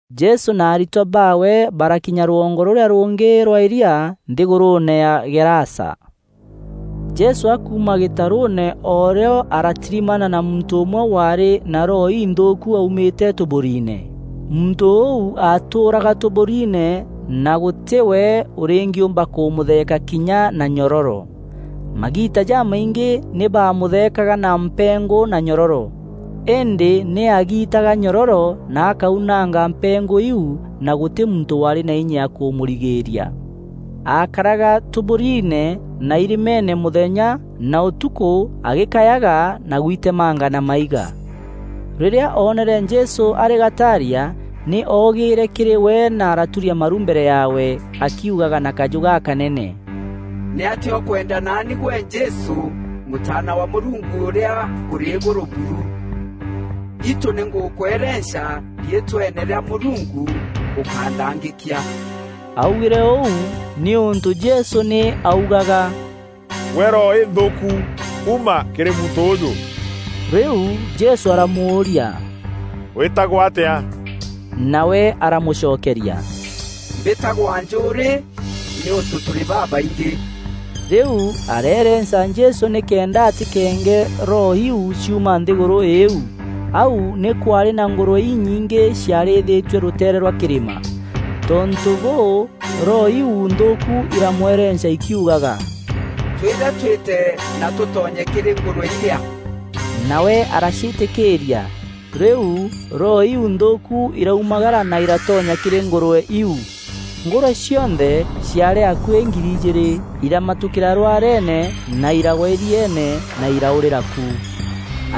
Jesû na aritwa baawe barakinya rwongo rûrîa rûngî rwa îria, nthîgûrûûne ya Gerasa. Jesû akuuma gîtarûûne o rîo aratirimana na muntû ûmwe waarî na roho inthûûku aumîte tûburiine. Muntû ûu atûûraga tûburiine na gûtî we ûrîngîûmba kûmûtheeka kinya na nyororo. Magiita jamaingî nî baamûtheekaga na mpengû na nyororo, îndî nî aagiitaga nyororo na akaunanga mpengû iu na gûtî muntû waarî na inya ya kûmûrigîîria. Aakaraga tûburiine na irîmeene mûthenya na ûtukû agîkayaga na gwitemanga na maiga. Rîrîa oonere Jesû arî gataaria, nî oogîîre kîrî we na aratûria maru mbere yaawe akiugaga na kajû gakanene, “Nîatîa ûkwenda naani, gwe Jesû Mûtaana wa Mûrungu Ûrîa Ûrî Îgûrû buru? Itû nî ngûkwerenca riitweene rîa Mûrungu ûkánthangîkia!” Aaugîre ûu nîûntû Jesû nî aaugaga, “Gwe roho înthûûku, uma kîrî muntû ûûjû.” Rîu Jesû aramûûria, “Wîtagwa atîa?” Nawe aramûcokeria, “Mbîtagwa ‘Njûûrî,’ nîûntû tûrî babaingî.” Rîu areerenca Jesû nîkenda atîkeenge roho iu ciuma nthîgûrû îîu. Au nî kwaarî na ngûrwe inyingî ciarîîthîtue rûteere rwa kîrîma. Tontû bûû, roho iu nthûûku iramwerenca ikiugaga, “Twîre twîte na tûtonye kîrî ngûrwe irîa.” Nawe araciîtîkîîria. Rîu roho iu nthûûku iraumagara na iratonya kîrî ngûrwe iu. Ngûrwe cionthe ciaarî akuî ngiri ijîîrî, iramatûkîîra rwareene na iragwa îrieene na iraûrîra ku.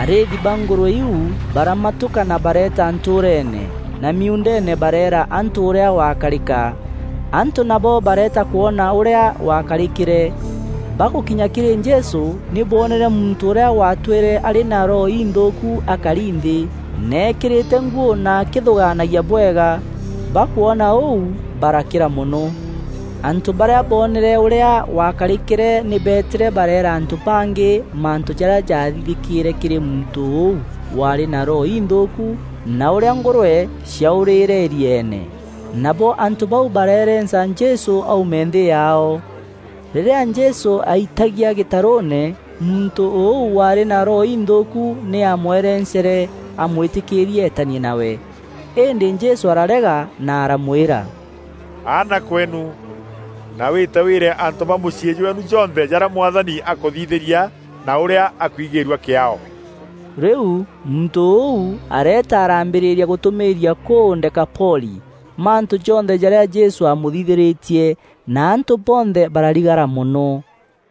Arîîthi ba ngûrwe iu baramatûka na bareeta ntûûreene na miuundeene bareera antû ûrîa gwakarîka. Antû nabo bareeta kwona ûrîa gwakarîkîre. Bagûkinya kîrî Jesû nî boonere muntû ûrîa waatwîre arî na roho inthûûku akari nthî, na eekîrîte nguû na akîthûgaanagia bwega. Bakwona ûu barakîra mono. Antû barîa boonere ûrîa gwakarîkîre nî beetîre bareera antû bangî mantû jarîa jaathithîkîre kîrî muntû ûu waarî na roho inthûûku na ûrîa ngûrwe ciaûrîîre îrieene. Nabo antû bau barerenca Jesû aume nthî yaao. Rîrîa Jesû aitagia gîtarûûne, muntû ûu waarî na roho inthûûku nî aamwerencere amwîtîkîîrie eetanie nawe. Îndî Jesû ararega na aramwîra, “Aana kweenu, na wîte wîre antû ba mûciî jweenu jonthe jarîa Mwathani akûthithîria na ûrîa akwigîîrua kîaao.” Rîu, muntû ûu areeta araambîrîria gûtûmîîria kûu Dekapoli mantû jonthe jarîa Jesû aamûthithîrîtie na antû bonthe bararigara mono.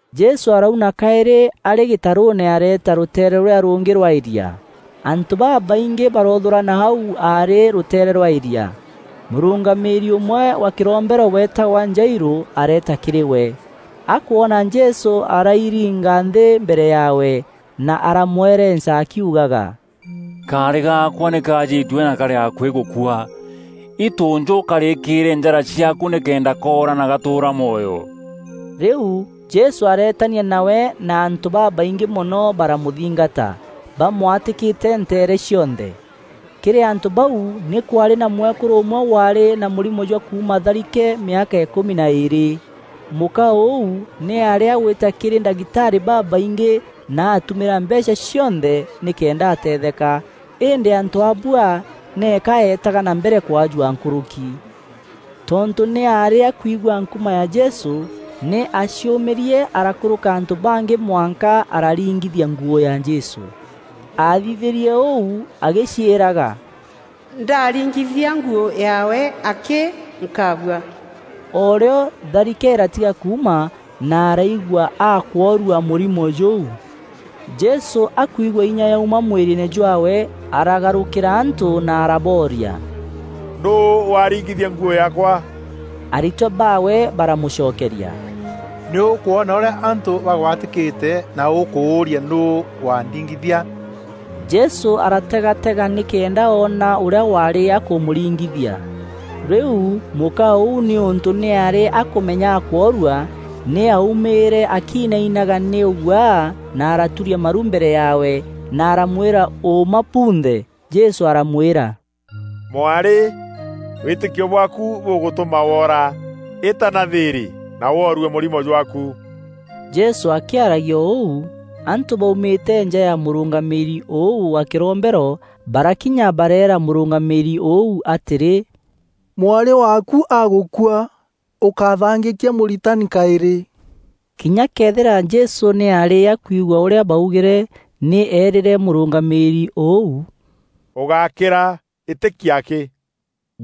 Jesû arauna kaîrî arî gîtarûûne areeta rûteere rûrîa rûngî rwa îria. Antû babaiingî baroothûrana au aarî rûteere rwa îria. Mûrûngamîîri ûmwe wa kîrombero weetagwa Jairû areeta kîrî we. Akwona Jesû arairinga nthî mbere yaawe na aramwerenca akiugaga, “Kaarî gaakwa nî kajîtue na karî akuî gûkua. Itû njû ûkarîkîîre njara ciaaku nîkenda koora na gatûûra mwoyo!” Rîu Jesû areetania nawe na antû babaingî mono baramûthingata bamwatîkîte nteere cionthe. Kîrî antû bau nî kwaarî na mwekûrû ûmwe waarî na mûrimo jwa kuuma tharike mîaka îkûmi na îîrî. Mûka ûu nî aarî agwîta kîrî ndagitarî babaingî na atumîra mbeecha cionthe nîkenda atetheka îndî antû aabua nîka eetaga na mbere kwajua nkûrûki. Tontû nî aarî akwigua nkuma ya Jesû, nî aaciûmîrie arakûrûka antû bangî mwanka araringithia nguû ya Jesû. Athithîrie ûu agîciîraga, “Ndaringithia nguû yaawe akî, nkaabua.” O rîo, tharike îratiga kuuma na araigua akworua mûrimo jûu. Jesû akwigua inya yauma mwîrîîne jwaawe, aragarûkîra antû na arabooria, “Nûû waringithia nguû yaakwa?” Aritwa baawe baramûcokeria, “Nî ûkwona ûrîa antû bagwatîkîte na ûkûûria nûû wandingithia?” Jesû arategatega nîkenda oona ûrîa waarî akûmûringithia. Rîu mûka ûu nîûntû nî aarî akûmenya akworua, nî aumîîre akiinainaga nî ûguaa na araturia maru mbere yaawe na aramwîra ûûma bunthe. Jesû aramwîra, “Mwarî, wîtîkio bwaaku bûgûtûma wora. Îta na thîîrî na woorue mûrimo jwaaku.” Jesû akîaragia o ûu, antû baumîte nja ya mûrûngamîîri ûu wa kîrombero, barakinya bareera mûrûngamîîri ûu atîrî, “Mwarî waaku agûkua. Ûkáthangîkia Mûritani kaîrî?” Kinya këethîra Jesû nî aarî akwigua ûrîa baugîre, nî eerîre mûrûngamîîri ûu, “Ûgákîra, îtîkia akî.”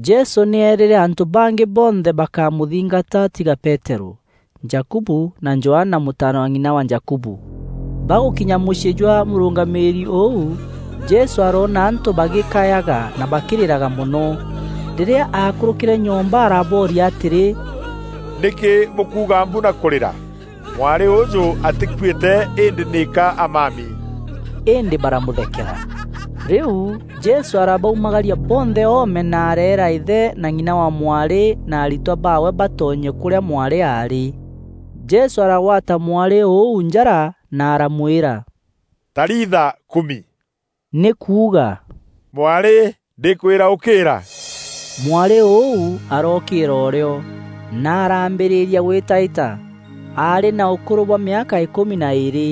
Jesû nî eerîre antû bangî bonthe bakámûthingata tiga Peterû, Jakubu na Johana, mûtaana wa ng'ina wa Jakubu. Bagûkinya mûciî jwa mûrûngamîîri ûu, Jesû aroona antû bagîkayaga na bakîrîraga mono. Rîrîa aakûrûkîre nyomba arabooria atîrî, “Nîkî bûkuuga mbu na kûrîra? Mwarî ûjû atîkuîte îndî nîka amami.” Îndî baramûthekeera. Rîu Jesû arabaumagaria bonthe oome na areera îthe na ng'ina wa mwarî na aritwa baawe batonye kûrîa mwarî aarî. Jesû aragwata mwarî ûu njara na aramwîra, “Talitha kumi,” nî kuuga “Mwarî, ndîkwîra ûkîîra.” Mwarî ûu arookîîra o rîo, na araambîrîria gwîtaîta. Aarî na ûkûrû bwa mîaka îkûmi na îîrî.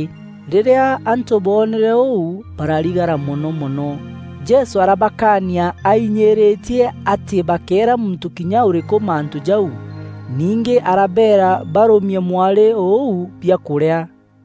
Rîrîa antû boonere ûu bararigara mono mono. Jesû arabakaania ainyîrîtie atî bakéera muntû kinya ûrîkû mantû jau. Ningî arabeera barûmie mwarî ûu biakûrîa.